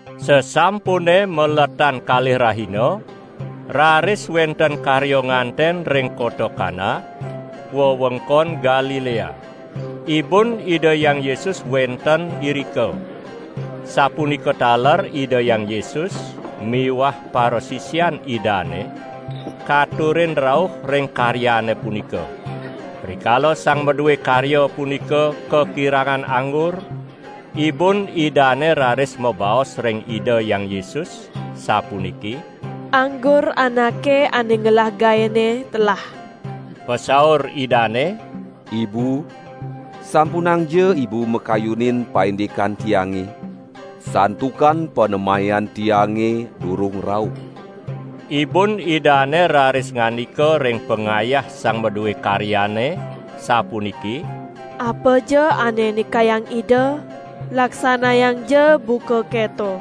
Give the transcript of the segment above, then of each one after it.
Sasampune maletan kalih rahina, raris wenten karya nganten ring kota Kana, wewengkon Galilea. Ibun Ida Hyang Yesus wenten irika. Sapunika taler Ida Hyang Yesus miwah parasisian Idane katurin rauh ring karyane punika. Rikala sang madue karya punika kakirangan anggur, ibun Idane raris mabaos ring Ida Hyang Yesus sapuniki: "Anggur anake ane ngelah gaene telah!" Pasaur Idane: "Ibu, sampunangja ibu makayunin paindikan Tiange, santukan panemayan Tiange durung rauh!" Ibun Idane raris ngandika ring pangayah sang madue karyane sapuniki: "Apaja ane nikayang Ida, laksanayangja buka keto!"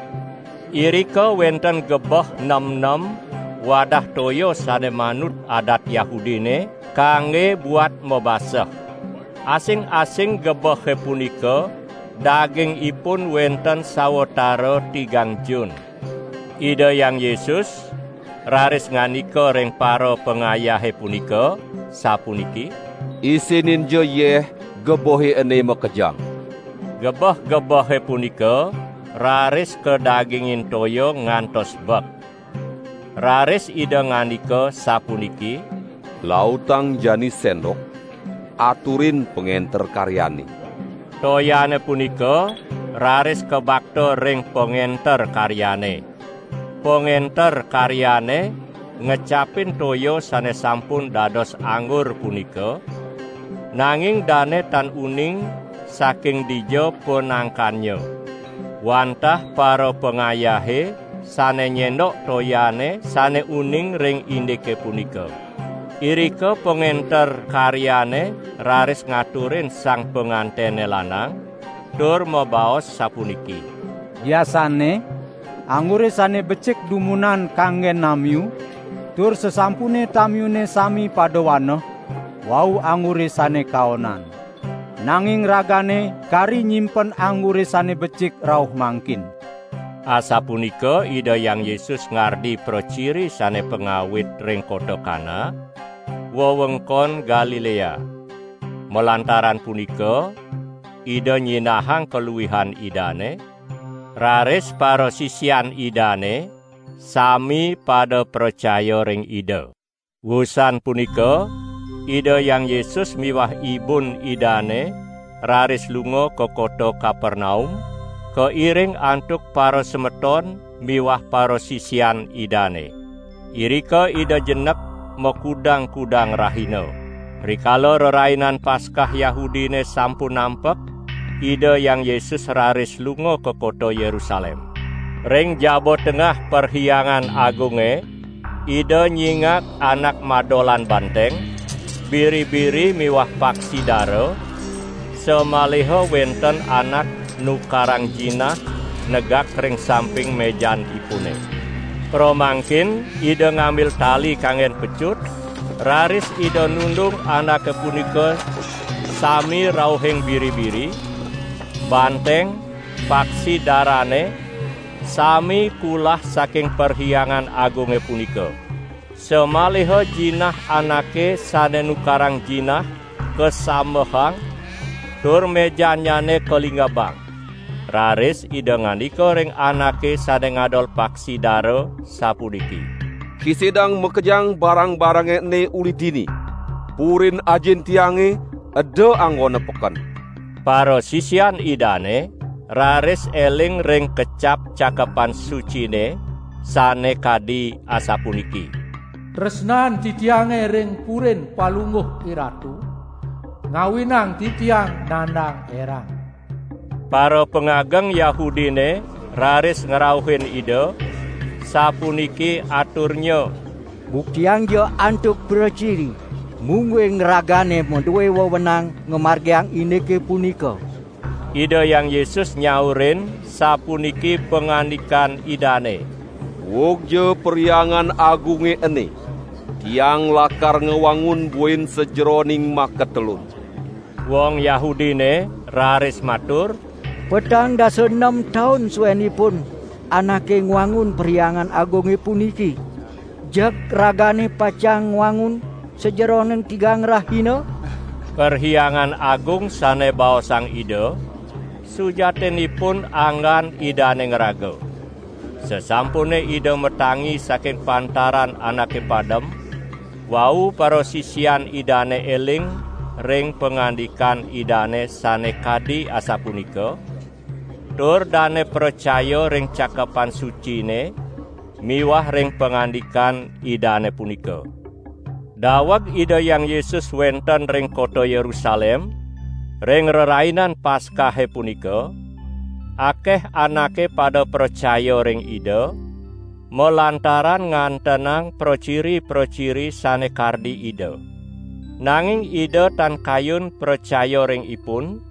Irika wenten gebeh nemnem wadah toya sane manut adat Yahudine kangge buat mabaseh. Asing-asing gebehe punika dagingipun wenten sawatara tigang jun. Ida Hyang Yesus raris ngandika ring parapangayahe punika, sapuniki: "Isininja yeh, gebehe ene makejang!" Gebeh-gebehe punika raris kadagingin toya ngantos bek. Raris Ida ngandika sapuniki: "Lautang jani sendok, aturin pangenter karyane!" Toyane punika raris kabakta ring pangenter karyane. Pangenter karyane ngecapin toya sane sampun dados anggur punika, nanging dane tan uning saking dija panangkannya. (Wantah parapangayahe sane nyendok toyane sane uning ring indike punika.) Irika pangenter karyane raris ngaturin sang pangantene lanang, tur mabaos sapuniki: "Biasanne anggure sane becik dumunan kanggen namiu, tur sasampune tamiune sami pada waneh, wau anggure sane kaonan. Nanging ragane kari nyimpen anggure sane becik rauh mangkin." Asapunika Ida Hyang Yesus ngardi praciri sane pangawit ring kota Kana, wewengkon Galilea. Malantaran punika Ida nyinahang kaluihan Idane, raris parasisian Idane sami pada pracaya ring Ida. Wusan punika Ida Hyang Yesus miwah ibun Idane raris lunga ka kota Kapernaum, kairing antuk parasemeton miwah parasisian Idane. Irika Ida jenek makudang-kudang rahina. Rikala Rerainan Paskah Yahudine sampun nampek, Ida Hyang Yesus raris lunga ka kota Yerusalem. Ring jaba tengah Perhyangan Agunge Ida nyingak anak madolan banteng, biri-biri miwah paksi dara, samaliha wenten anak nukarang jinah negak ring samping mejanipune. Pramangkin Ida ngambil tali kanggen pecut, raris Ida nundung anake punika sami rauhing biri-biri, banteng, paksi darane sami kulah saking Perhyangan Agunge punika. Samaliha jinah anake sane nukarang jinah kasambehang tur mejannyane kalingebang. Raris Ida ngandika ring anake sane ngadol paksi dara sapuniki: "Kisidang makejang barang-barange ene uli dini. Purin Ajin Tiange eda anggona peken!" Parasisian Idane raris eling ring kecap Cakepan Sucine sane kadi asapuniki: "Tresnan Titiange ring Purin Palungguh IRatu ngawinang Titiang nandang erang!" Parapangageng Yahudine raris ngrauhin Ida sapuniki aturnya: "Buktiangja antuk praciri, mungguing Ragane madue wewenang ngamargiang indike punika!" Ida Hyang Yesus nyaurin sapuniki pangandikan Idane: "Uugja Perhyangan Agunge ene, Tiang lakar ngwangun buin sajeroning makatelun." Wong Yahudine raris matur: "Petang dasa nem taun suenipun anake ngwangun Perhyangan Agunge puniki, jeg Ragane pacang ngwangun sajeroning tigang rahina?" Perhyangan Agung sane baosang Ida, sujatinipun anggan Idane ngraga. Sasampune Ida matangi saking pantaran anake padem, wau parasisian Idane eling ring pangandikan Idane sane kadi asapunika; tur dane pracaya ring Cakepan Sucine miwah ring pangandikan Idane punika. Daweg Ida Hyang Yesus wenten ring kota Yerusalem ring Rerainan Paskahe punika, akeh anake pada pracaya ring Ida, malantaran ngantenang praciri-praciri sane kardi Ida. Nanging Ida tan kayun pracaya ring ipun,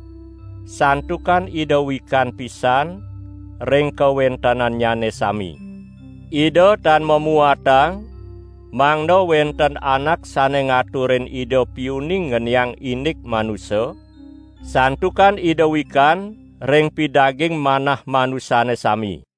santukan Ida wikan pisan ring kawentenannyane sami. Ida tan mamuatang mangda wenten anak sane ngaturin Ida piuning ngeniang indik manusa, santukan Ida wikan ring pidaging manah manusane sami.